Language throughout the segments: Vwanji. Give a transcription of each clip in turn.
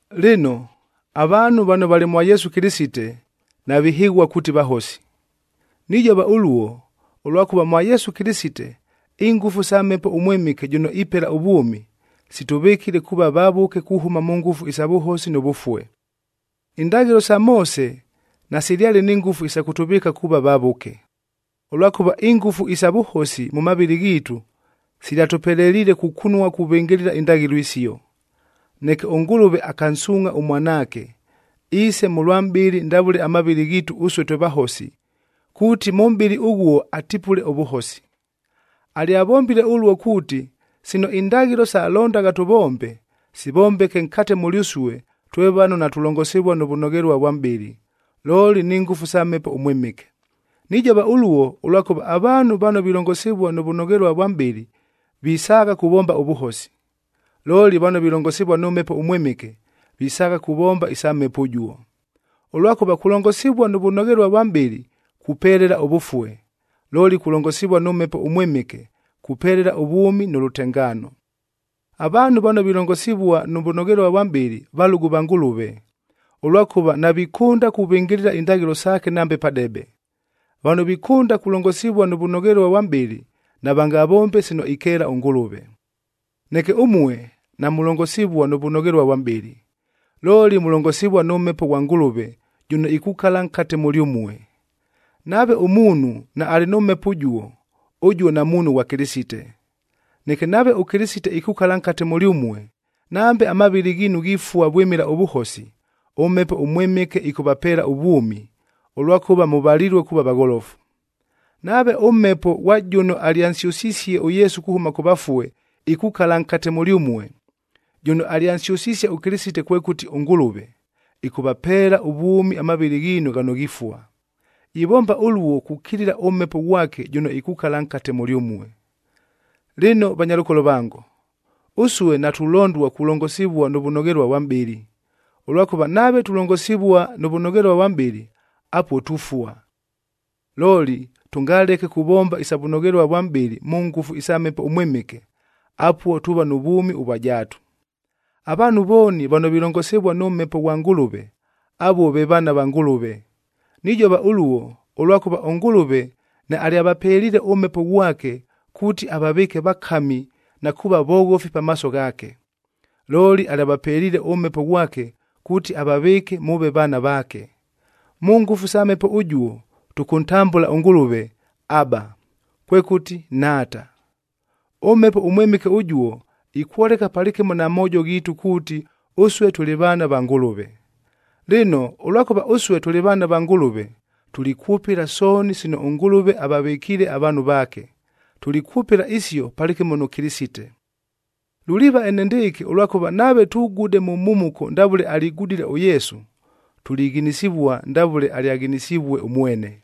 Lɨno, avaanhu vano valɨ mwa Yesu Kɨlɨsite, navihɨghua kuuti vahosi. Nijova ʉluo, ʉlwakʉva mwa Yesu Kɨlɨsite, ingʉfu sa Mhepo ʉMwɨmɨke jʉno ipela ʉvwʉmi, sitʉvɨkile kuuva vavʉke kuhʉma mʉ ngʉfu isa vʉhosi nʉ vʉfue. Indaghɨlo sa Moose nasilyale ni ngʉfu isa kʉtʉvɨɨka kuuva vavʉke, ʉlwakʉva ingʉfu isa vʉhosi mʉ mavɨlɨ ghiitu silyatʉpeleliile kukunua kuvɨngɨlɨla indaghɨlo isio. Neke ʉNgʉlʉve akansuungʼha ʉMwanaake, iise mʉlwa mʼbɨlɨ ndavʉle amavɨlɨ ghiitu ʉsue twe vahosi, kuuti mʉ mʼbɨlɨ ʉghuo atipule ʉvʉhosi. Alyavombile ʉluo kuuti, sino indaghɨlo salondagha tʉvombe, sivombeke nkate mʉlyʉsue twe vano natulongosivua nʉ vʉnoghelua vwa mʼbɨlɨ, looli ni ngʉfu sa Mhepo ʉMwɨmɨke. Nijova ʉluo, ʉlwakʉva avaanhu vano vilongosivua nʉ vʉnoghelua vwa mʼbɨlɨ, visaagha kuvomba ʉvʉhosi. Looli vano vilongosivua nʉ Mhepo ʉMwɨmɨke, visaagha kuvomba isa Mhepo ʉjuo. Ʉlwakʉva kulongosivua nʉ vʉnoghelua vwa mʼbɨlɨ kupelela ʉvʉfue, looli kulongosivua nʉ Mhepo ʉMwɨmɨke kupelela ʉvwʉmi nʉ lʉtengaano. Avaanhu vano vilongosivua nʉ vʉnoghelua vwa mʼbɨlɨ, valʉgʉ va Ngʉlʉve, ʉlwakʉva navikʉnda kuvɨngɨlɨla indaghɨlo saake nambe padebe. Vano vikʉnda kulongosivua nʉ vʉnoghelua vwa mʼbɨlɨ, navangavombe sino ikeela ʉNgʉlʉve. Neke ʉmue namulongosivua nʉ vʉnoghelua vwa mʼbɨlɨ, looli mulongosivua nʉ Mhepo ghwa Ngʉlʉve jʉno ikukala nkate mʉlyʉmue. Nave ʉmuunhu naalɨ nʉ Mhepo ʉjuo, ʉjuo namuunhu ghwa Kɨlɨsite. Neke nave ʉKɨlɨsite ikukala nkate mʉlyʉmue, nambe amavɨlɨ ghiinu ghifua vwɨmɨla ʉvʉhosi, ʉMhepo ʉMwɨmɨke ɨkʉvapeela ʉvwʉmi, ʉlwakʉva mʉvalilue kuuva vagholofu. Nave ʉMhepo ghwa jʉno alyansyʉsisie ʉYesu kuhʉma kʉ vafue, ikukala nkate mʉlyʉmue, jʉno alyansyʉsisie ʉKɨlɨsite kwekʉti ʉNgʉlʉve, ɨkʉghapeela ʉvwʉmi amavɨlɨ ghiinu ghano ghifua. Ivomba ʉluo kukilila ʉMhepo ghwake jʉno ikukala nkate mʉlyʉmue. Lɨno vanyalʉkolo vango, ʉsue natulondua kulongosivua nʉ vʉnoghelua vwa mʼbɨlɨ, ʉlwakʉva nave tulongosivua nʉ vʉnoghelua vwa mʼbɨlɨ, apuo tufua. Looli tʉngaleke kuvomba isa vʉnoghelua vwa mʼbɨlɨ mʉ ngʉfu sa Mhepo ʉMwɨmɨke, apuo tuuva nʉ vwʉmi ʉvwa jaatu. Avaanhu vooni vano vilongosivua nʉ Mhepo ghwa Ngʉlʉve, avuo ve vaana va Ngʉlʉve. Nijova ʉluo, ʉlwakʉva ʉNgʉlʉve naalyavapeliile ʉMhepo ghwake, kuuti avavɨɨke vakami na kuuva voghofi pamaaso ghaake. Looli alyavapeliile ʉMhepo ghwake kuuti avavɨɨke mʉʉve vaana vaake. Mʉ ngʉfu sa Mhepo ʉjuo, tʉkʉntambʉla ʉNgʉlʉve, “Aba,” kwekʉti, Nhaata. ɄMhepo ʉMwɨmɨke ʉjuo ikwoleka palɨkɨmo na moojo ghiitu kuuti ʉsue tʉlɨ vaana va Ngʉlʉve. Lɨno, ʉlwakʉva ʉsue tʉlɨ vaana va Ngʉlʉve, tulikwʉpɨla sooni sino ʉNgʉlʉve avavɨkiile avaanhu vaake, tulikwʉpɨla isio palɨkɨmo nʉ Kɨlɨsite. Luliiva enendɨɨkɨ ʉlwakʉva nave tugude mʉ mhumuko ndavʉle aligudile ʉYesu, tulighinisivua ndavʉle alyaghinisivue ʉmwene.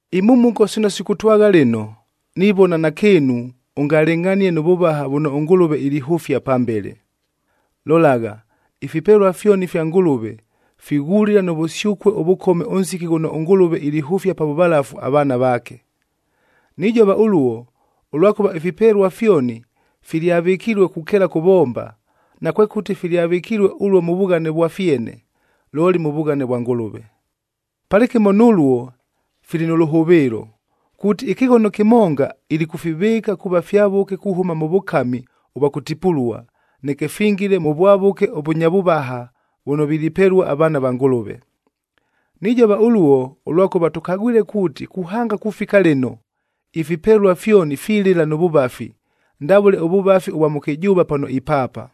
Imhumuko sino sikʉtwagha lɨno, nivona nakɨɨnu ʉngalɨngʼhanie nʉ vʉvaha vʉno ʉNgʉlʉve ilihʉfia pambele. Lolagha, ifipelua fyoni ifya Ngʉlʉve, fighulila nʉ vʉsyʉkue ʉvʉkome ʉnsiki ghʉno ʉNgʉlʉve ilihʉfia pa vʉvalafu avaana vaake. Nijova ʉluo, ʉlwakʉva ifipelua fyoni filyavɨkilue kukeela kʉvomba, nakwekʉti filyavɨkilue ʉluo mʉ vughane vwa fyene, looli mʉ vughane vwa Ngʉlʉve. Palɨkɨmo nʉluo fili nʉ lʉhʉvɨɨlo, kuuti ɨkɨghono kɨmonga, ilikʉfivɨɨka kuuva fyavʉke kuhʉma mʉ vʉkami ʉvwa kʉtipulua, neke fingile mʉ vwavʉke ʉvʉnya vʉvaha vʉno vilipelua avaana va Ngʉlʉve. Nijova ʉluo, ʉlwakʉva tʉkagwile kuuti kuhanga kufika lɨno, ifipelua fyoni filɨla nʉ vʉvafi, ndavʉle ʉvʉvafi ʉvwa mʉkɨjʉʉva pano ipaapa.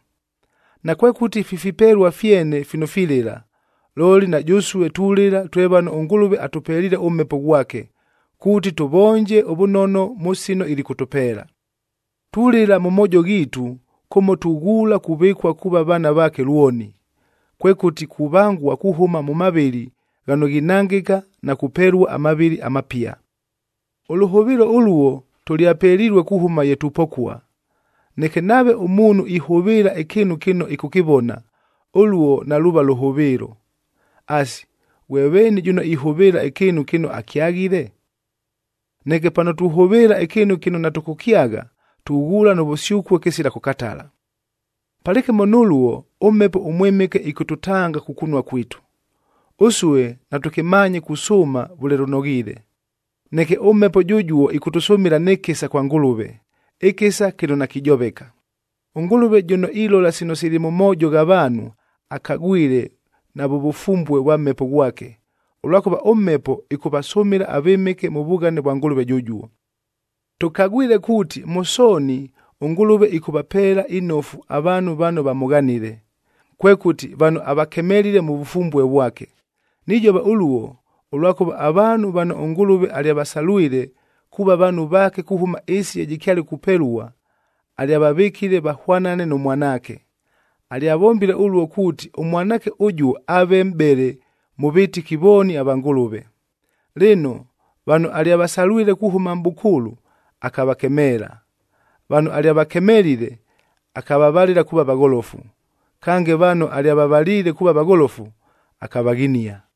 Nakwekʉti fi fipelua fyene fino filɨla, looli na jʉsue tulɨla twe vano ʉNgʉlʉve atʉpeliile ʉMhepo ghwake, kuuti tʉvonje ʉvʉnono mʉ sino ilikʉtʉpeela. Tulɨla mʉ moojo ghiitu kʉmo tughuula kuvɨkua kuuva vaana vaake lwoni, kwekʉti kuvangua kuhʉma mʉ mavɨlɨ ghano ghinangɨka na kupelua amavɨlɨ amapia. Ʉlʉhʉvɨɨlo ʉluo tʉlyapelilue kuhʉma ye tupokua. Neke nave ʉmuunhu ihʉvɨɨla ɨkɨɨnu kɨno ɨkʉkɨvona, ʉluo naluuva lʉhʉvɨɨlo. Asi, ghwe veeni jʉno ihʉvɨɨla ɨkɨɨnu kɨno akyaghile? Neke pano tuhʉvɨɨla ɨkɨɨnu kɨno natʉkʉkyagha, tughuula nʉ vʉsyʉkue kɨsila kʉkatala. Palɨkɨmo nʉluo ʉMhepo ʉMwɨmɨke ɨkʉtʉtanga kukunua kwitu. Ʉsue natʉkɨmaanye kusʉʉma vʉle lʉnoghiile, neke ʉMhepo jʉjuo ɨkʉtʉsʉmɨla nɨ kɨsa kwa Ngʉlʉve, ɨkɨsa kɨno nakijoveka. ɄNgʉlʉve jʉno ilola sino sili mʉ moojo gha vaanhu, akagwile navʉ vʉfumbue vwa Mhepo ghwake, ʉlwakʉva ʉMhepo ɨkʉvasʉmɨla avɨmɨke mʉ vughane vwa Ngʉlʉve jʉjuo. Tʉkagwile kuuti, mʉ sooni ʉNgʉlʉve ɨkʉvapeela inofu avaanhu vano vamʉghanile, kwekʉti vano avakemelile mʉ vʉfumbue vwake. Nijova ʉluo, ʉlwakʉva avaanhu vano ʉNgʉlʉve alyavasalwile kuuva vaanhu vaake kuhʉma ɨɨsi ye jɨkyale kupelua, alyavavɨkile vahwanane nʉ Mwanaake. Alyavombile ʉluo kuuti ʉMwanaake ʉjuo aave mʼbele mʉ vɨtɨki vooni va Ngʉlʉve. Lɨno, vano alyavasalwile kuhʉma mʼbʉkʉʉlʉ, akavakemeela; vano alyavakemelile, akavavalɨla kuuva vagholofu; kange vano alyavavaliile kuuva vagholofu, akavaghinia.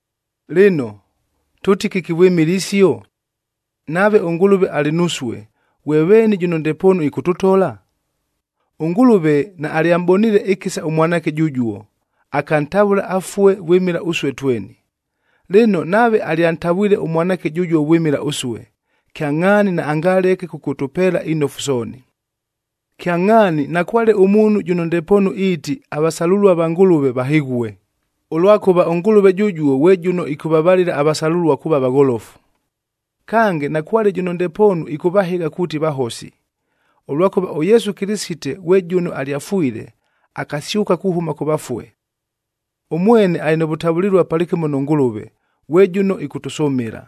Lɨno, tʉʉti kɨki vwɨmɨla isio? Nave ʉNgʉlʉve alɨ nusue, ghwe veeni jʉno ndepoonu ɨkʉtʉtola? ɄNgʉlʉve naalyamʼboniile ɨkɨsa ʉMwanaake jʉjuo, akantavʉla afue vwɨmɨla ʉsue tweni. Lɨno, nave alyantavwile ʉMwanaake jʉjuo vwɨmɨla ʉsue, kyangʼhaani naangaleke kʉkʉtʉpeela inofu sooni. Kyangʼhaani nakwale ʉmuunhu jʉno ndepoonu iiti avasalʉlua va Ngʉlʉve vahɨghue, ʉlwakʉva ʉNgʉlʉve jʉjuo ghwe jʉno ɨkʉvavalɨla avasalʉlua kuuva vagholofu. Kange, nakwale jʉno ndepoonu ɨkʉvahɨgha kuuti vahosi, ʉlwakʉva ʉYesu Kɨlɨsite ghwe jʉno alyafwile, akasyʉka kuhʉma kʉ vafue. Ʉmwene alɨ nʉ vʉtavʉlɨlua palɨkɨmo nʉ Ngʉlʉve, ghwe jʉno ɨkʉtʉsʉmɨla.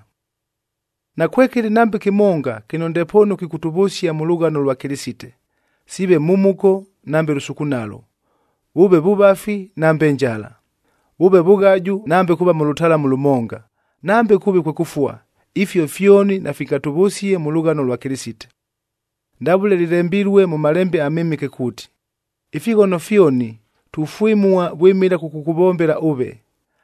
Nakwekɨlɨ nambe kɨmonga kɨno ndepoonu kɨkʉtʉvʉsia mʉ lʉghano lwa Kɨlɨsite! Siive mhumuko nambe lʉsukunalo, vʉʉve vʉvafi nambe njala, vʉʉve vʉghaju nambe kuuva mʉ lʉtalamu lʉmonga, nambe kʉʉve kwe kʉfua, ifio fyoni nafingatʉvʉsie mʉ lʉghano lwa Kɨlɨsite. Ndavʉle lɨlembilue mʉ Malembe aMɨmɨke kuuti, “Ifighono fyoni tufwɨmua vwɨmɨla kʉkʉkʉvombela ʉve.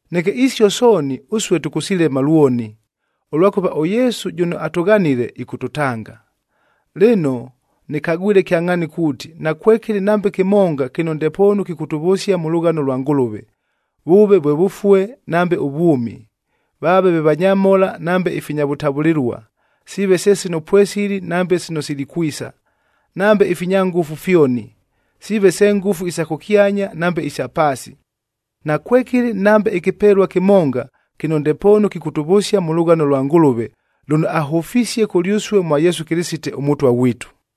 Neke isio sooni ʉsue tʉkʉsilema lwoni, ʉlwakʉva ʉYesu jʉno atʉghanile, ɨkʉtʉtanga. Lɨno nɨkagwile kyangʼhaani kuuti, nakwekɨlɨ nambe kɨmonga kɨno ndepoonu kɨkʉtʉvʉsia mʉ lʉghano lwa Ngʉlʉve, vʉʉve vwe vʉfue nambe ʉvwʉmi, vaave ve vanyamhola nambe ifinya vʉtavʉlɨlua, siive se sino pwesili nambe sino silikwisa, nambe ifinya ngʉfu fyoni, siive se ngʉfu isa kʉkyanya nambe isa paasi. Nakwekɨlɨ nambe ɨkɨpelua kɨmonga kɨno ndepoonu kɨkʉtʉvʉsia mʉ lʉghano lwa Ngʉlʉve lʉno ahʉfisie kʉlyʉsue mwa Yesu Kɨlɨsite, ʉMʉtwa ghwitu.